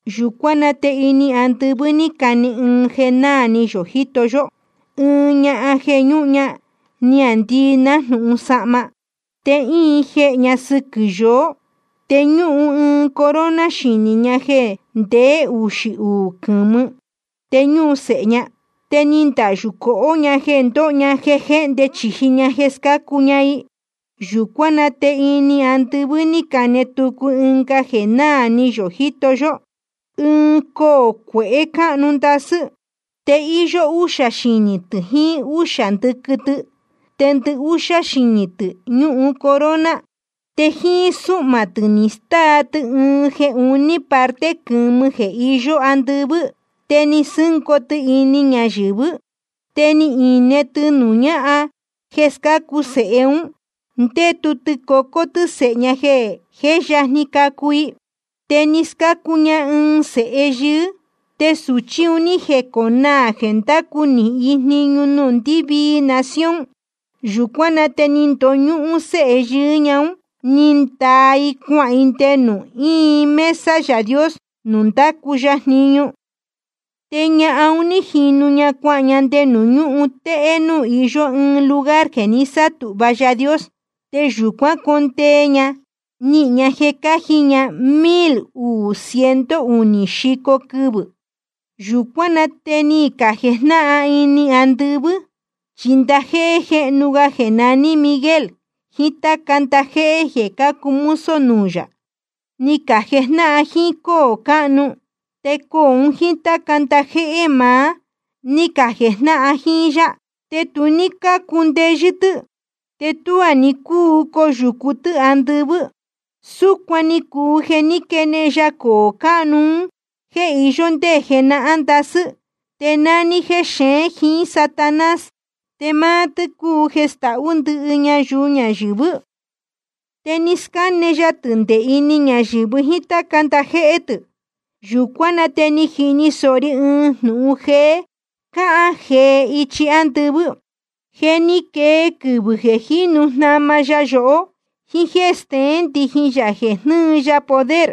Yūcuán na te ini andɨvɨ́ ní cane ɨɨn jeē nahán náā ni yō jíto yó: Ɨɨn ñahan jeē ñúhun ña niāndii nájnūhun sahma, te íin jehē ña sɨquɨ̄ yoó, te ñúhun ɨɨn corona xinī ña jeē ndeé uxī uū quɨ̄mɨ. Te ñúhun sēhe ña. Te ni ndahyū cohó ña jeē ndóho ña jéhnde chīji ña jeē scácu ña i. Yūcuán na te ini andɨvɨ́ ní cane tucu ɨnga jeē náā ni yō jíto yó: Ɨɨn coō cuehé cáhnu ndasɨ́. Te íyó úxā xinī tɨ̄ jiín úxī ndɨquɨ tɨ. Te ndɨhúxá xinī tɨ̄ ñúhun corona. Te jíín súhmā tɨ̄ ni stáa tɨ ɨɨn jeē uní parte quɨ̄mɨ jeē iyó andɨvɨ́, te ni sɨ́ngoo tɨ ini ñayɨ̄vɨ́. Te ni ine tɨ nuū ñáhan jeē scácu sēhe ún, ndétu tɨ cocó tɨ́ sēhe ña jeē jé yajni cacu i. Te ni scácu ña ɨɨn sēhe yɨɨ́, te sūchi un ní jeconaā jeē ndácu nīhin i jniñu nuū ndɨ́vii nación. Yūcuán na te ni ndoñúhún séhe yɨɨ́ ña ún, ni ndaa i cuahān i nde nuū íin mesa Yaā Dios nuū ndácu ya jniñu. Te ñahan un ní jinu ña cuahān ña nde nuū ñúhun téhé núū iyó ɨɨn lugar jeē ni sátūhva Yaā Dios. Te yūcuán condee ña nihīn ña jeē cáji ña mil uū ciento unī xico quɨvɨ̄. Yūcuán na te ni cajejnáhan ini andɨvɨ́. Chi ndajéhé jéhnu ga jeē naní Miguel jiín táca ndajéhé jeē cácuu mozo nuū yā, ni cajejnáhan jíín cóō cáhnu. Te coō un jíín táca ndajéhé maá, ni cajejnáhan jíín yá. Te tu ní cácundeyɨ́ tɨ́, te tuá ní cúu coyūcu tɨ́ andɨvɨ́. Súcuan ni cuu jeē ní quenehen ya coō cáhnu un jéē iyó ndé jenahán ndasɨ́. Te nání tɨ́ jexeén jíín Satanás, te máá tɨ́ cúu jeē stahú ndɨhɨ ñayuu ñayɨ̄vɨ́. Te ni scáne ya tɨ̄ nde ini ñayɨ̄vɨ jíín táca ndajéhé tɨ̄. Yūcuán na te ni jini sōho ri ɨɨn jnūhun jeē cahán jee ichi ándɨvɨ́: Je ni quee quɨvɨ̄ jeē jínu jnama ya yohó, jíín jéē steén ndijin yā jeē jnɨ́ɨ ya poder,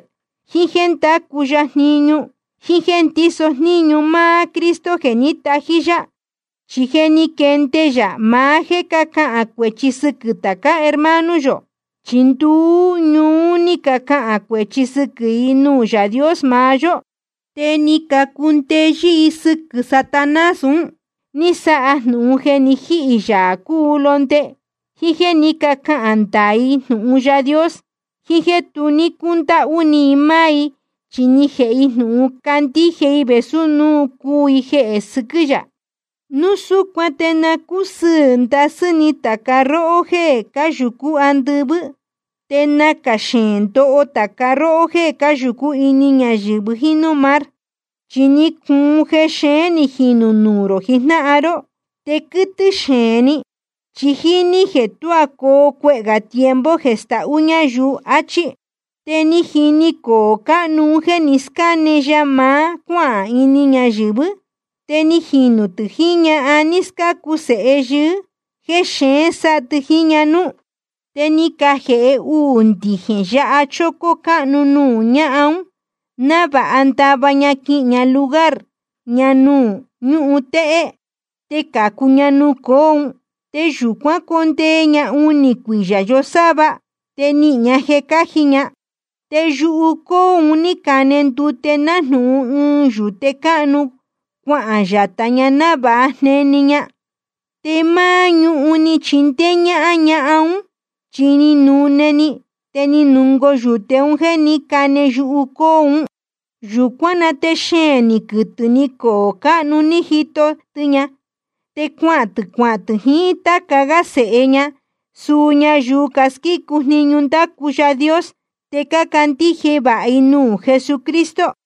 jiín jéē ndácu ya jniñu, jíín jéē ndíso jníñu máá Cristo jeē ní tají yá. Chi je ni quenehen ya maá jéē cahán cuēchi sɨquɨ̄ tācá hermano yō. Chi nduú ñuú ni cahān cuēchi sɨquɨ̄ i nuū Yaā Dios maá yó. Te ni cacundeyɨ́ i sɨquɨ̄ Satanás un, ní sáha jnūhun jeē ni jíhī Yaā cúu Londe, jíín jéē ní cacahān ndaā i jnūhun Yaā Dios, jiín jéē tu ní cundáhú ni i máá i, chi ni jēhe i jnūhun candíje i vēsú núu cuu i jeē sɨquɨ́ yā. Núu súcuan te na cúsɨɨ̄ ndasɨ́ ni tāca róhó jéē cáyūcú andɨvɨ́. Te nacā xeēn ndoho tāca róhó jéē cáyūcú ini ñayɨ̄vɨ jíín núū mar. Chi ni cuun jexeén ni jinū nuū rō jijnáhan ró. Te quɨ́tɨ́ xeēn ni, chi jíní jeē tuá coo cuehē gā tiempo jeē stahú ñayuu. Achí. Te ni jini coō cáhnu ún jéē ni scáne ya maá cuáhān ini ñayɨ̄vɨ́, te ni jinu tɨ jiín ñahan ní scácu sēhe yɨɨ́, jeē xeēn sáha tɨ jiín ña núú. Te ni cajēhe uū ndijēn yaha chócó cáhnu nuū ñahan ún, návāha ndava ña quihīn ña lugar ña nuū ñúhun téhé, te cācu ña nuū coō ún. Te yūcuán condee ña unī cuiyā yosáva, te nihīn ña jeē cáji ña. Te yuhu cóō un ní cane ndute nájnūhun ɨɨn yūte cáhnu, cuahān yatā ña návāha jneni ña. Te máá ñuhun chi ni chindéé ñáhán ñahan ún, chi ni nune‑ni, te ni nungoo yūte jeē ní cane yuhu cóō ún. Yūcuán na te xeēn ni quɨtɨ̄ ni coō cáhnu ni jito tɨ ña. Te cuahān tɨ̄ cuajnáhan tɨ jiín táca gá sēhe ña, suu ñayuu casquícu jniñu ndácu Yaā Dios te cácandíje vāha i jnūhun Jesucristo.